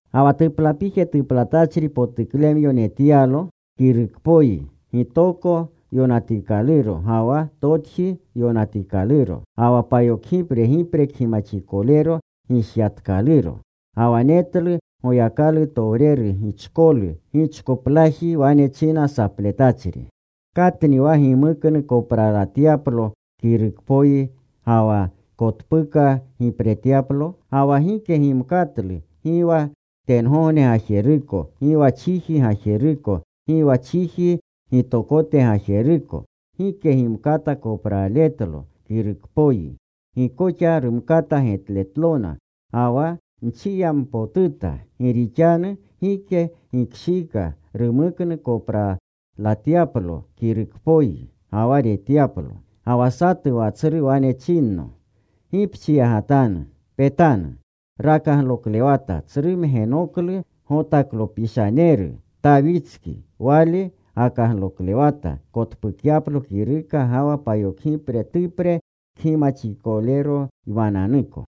Ga wa tuplapije tuplatachri potuklemyo netyalo kirukpoyi, gitoko yonatikaluro ga wa totji yonatikaluro. Ga wa payokgipre gipre kgimaxikolero gishyatkaluro. Ga wa netlu Goyakalutowreru gichkolu gichkoplaji wane china sapletachri, “¿Katni wa gimuknu kopralatyaplo kirukpoyi, ga wa kotpuka gipretyaplo?” Ga wa gike gimkatlu, gi wa tengogne gajeruko, gi wa chiji gajeruko, gi wa chiji gitokote gajeruko. Gike gimkata kopraaletlo kirukpoyi. Gi koxa rumkata getletlona. Ga wa nchiyampotuta, gi rixanu gike gikshiika rumuknu kopralatyaplo kirukpoyi ga wa retyaplo. Ga wa satu wa tsru wane chinno, “Gi pchiyagatanu. Petanu. Rakagloklewata tsru mgenoklu Gotaklopishaneru, Tawitski. Wale gakagloklewata kotpukyaplo kiruka ga wa payokgipre tupre kgimaxikoleroymananuko.”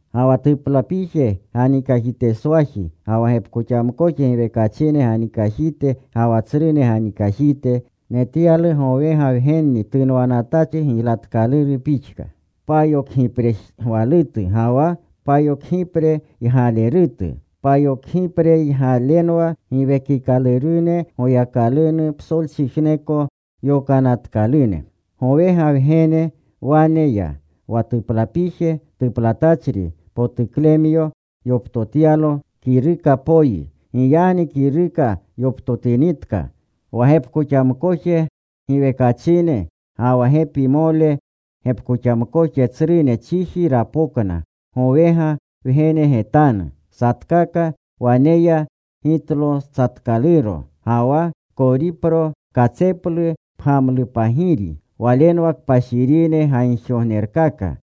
Ga wa tuplapije ganikajiteswaji, ga wa gepkoxamkoje giwekachine ganikajite ga wa tsrune ganikajite, netyalu gowega Wgenni tunwanatachri giylatkaluru pixka, payokgipregwalutu, ga wa payokgipreygalerutu. Payokgipreygalenwa payokgipre giwekikalurune Goyakalunu psolchijneko yokanatkalune. Gowega Wgene wane ya. Wa tuplapije tuplatachri potuklemyo yoptotyalo kirukapoyi. Giyagni kiruka yoptotinitka, wa gepkoxamkoje giwekachine, ga wa gepimole gepkoxamkoje tsrune chiji rapokna gowega Wgene getanu. Satkaka waneya gitlotsatkaluro, ga wa koripro katseplu pgamlupagiri. Walenwa kpashirine gagjigognerkaka.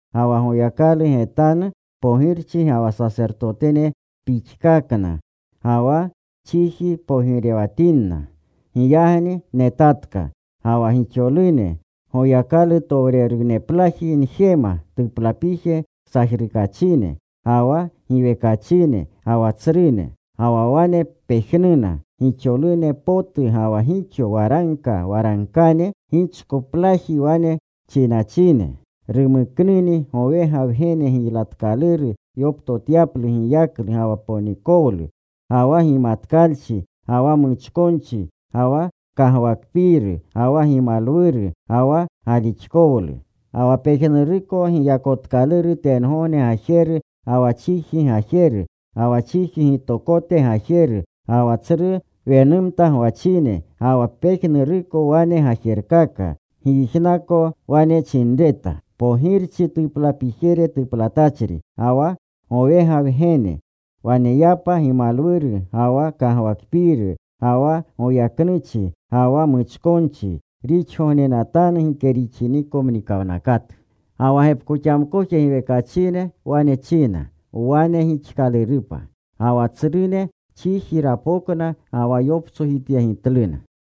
Ga wa Goyakalu getanu pogirchine ga wa sasertotene pixkakna. Ga wa chiji pogirewatinna. Giyagni netatka. Ga wa gixolune Goyakalutowreruneplaji njema, tuplapije sajrukachine, ga wa giwekachine ga wa tsrune. Ga wa wane pejnuna gixolune potu ga wa gixo waragka waragkane, gichkoplaji wane chinachine: Rumuknuni gowega Wgene giylatkaluru yoptotyaplu giyaklu ga wa ponikowlu, ga wa gimatkalchi, ga wa muchkonchi, ga wa kagwakpiiru, ga wa gimalwuru, ga wa galixkowlu. Ga wa pejnuruko giyakotkaluru tengogne gajeru ga wa chiji gajeru, ga wa chiji gitokote gajeru, ga wa tsru wenumta gwachine, ga wa pejnuruko wane gajerkaka, nyijnako wane chinreta: Pogirchi tuplapijere tuplatachri, Ga wa gowega Wgene waneyapa gimalwuru ga wa kagwakpiiru, ga wa goyaknuchi, ga wa muchkonchi, rixgognenatanu gike rixiniko mnikawnakatu. Ga wa gepkoxamkoje giwekachine wane china, “Wane gixkalurupa.” Ga wa tsrune chiji rapokna ga wa yoptsojityegitluna.